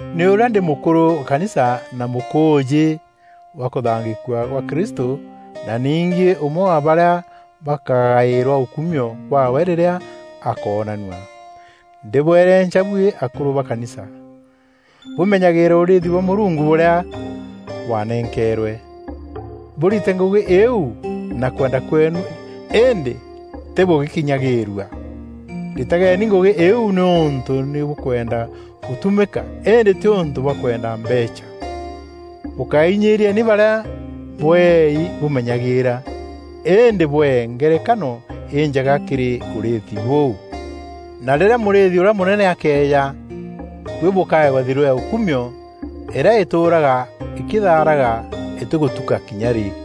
Ni ûrîa ndî mûkûrû wa kanisa na mûkûûjî wa kûthangîkua gwa Kristû na ningî ûmwe wa barîa bakagaîrwa ûkumio bwaawe rîrîa akoonanua, ndîbwerenca buî akûrû ba kanisa, bûmenyagîîre ûrîîthi bwa Mûrungu bûrîa bwanenkeerwe. Bûrite ngûgî îîu na kwenda kweenu îndî tî bûgîkinyagîîrua. Ritageni ngûgî îîu nîûntû nî bûkwenda gûtumîka îndî tîûntû bwa kwenda mbeecha. Bûkainyîîrieni barîa bweei bûmenyagîîra, îndî bwee ngerekano înjega kîrî ûrîîthi bûu, na rîrîa Mûrîîthi ûrîa Mûnene akeeja, buî bûkaewa thirû ya ûkumio îrîa îtûûraga îkîthaaraga îtîgûtuka kinya rî.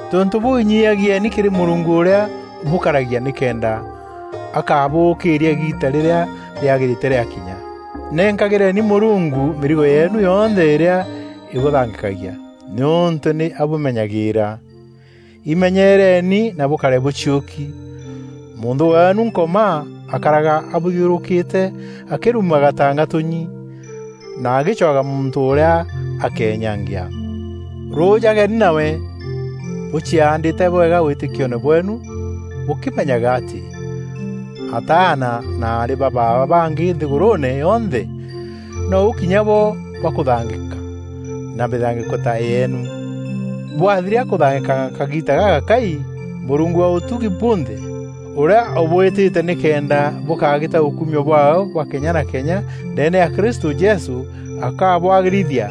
Tontû bûû, inyiiagieni kîrî Mûrungu ûrîa ûbûkaragia nîkenda akabûûkîîria îgiita rîrîa rîagîrîte rîakinya. Nenkagîreni Mûrungu mîrigo yeenu yonthe îrîa îbûthangîkagia, nîûntû nî abûmenyagîîra. Imenyereeni na bûkare bûciûki. Mûnthû weenu Nkoma, akaraga abûthiûrûkîte akîruumaga ta ngatûnyi na agîcwaga muntû ûrîa akeenyangia. Rûûjageni nawe, bûciaandîte bwega wîtîkioone bweenu bûkîmenyaga atî ataana na aarî ba baaba bangî nthîgûrûûne yonthe nou kinya bo bakûthangîka na mîthangîko ta yeenu. Bwathiria kûthangîkanga kagiita gagakai, Mûrungu wa ûtugi bunthe, ûrîa ûbwîtîte nîkenda bûkagîta ûkumio bwaawe bwa kenya na kenya ndeene ya Kristû Jesû, akabwagîrithia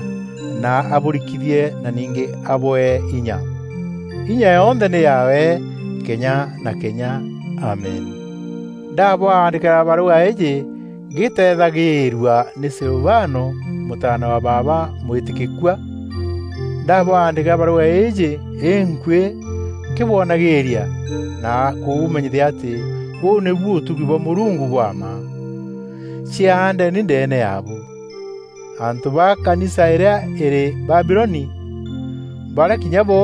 na abûrikithie na ningî abwee inya. Inya yonthe nî yaawe kenya na kenya. Amen. Ndabwandîkîra barûga îîjî ngîteethagîîrua nî Silivano, mûtaana wa baaba mwîtîkîkua. Ndabwandîkîra barûga îîjî înkuîî nkîbwonagîîria na kûbûmenyithia atî bûu nîbu ûtugi bwa Mûrungu bwa mma. Ciaandeni ndeene yaabu. Antû ba kanisa îrîa îrî Babiloni, barîa kinya bo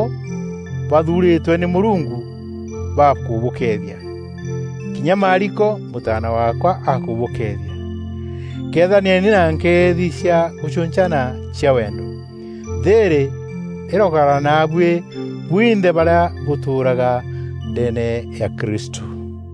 bathuurîtwe nî Mûrungu bakûbûkeethia. Kinya Maariko, mûtaana waakwa, akûbûkeethia. Kethanieni na nkeethi cia gûcûncana cia wendo. Thîîrî îrokaraga naabuî bwinthe barîa bûtûûraga ndeene ya Kristû.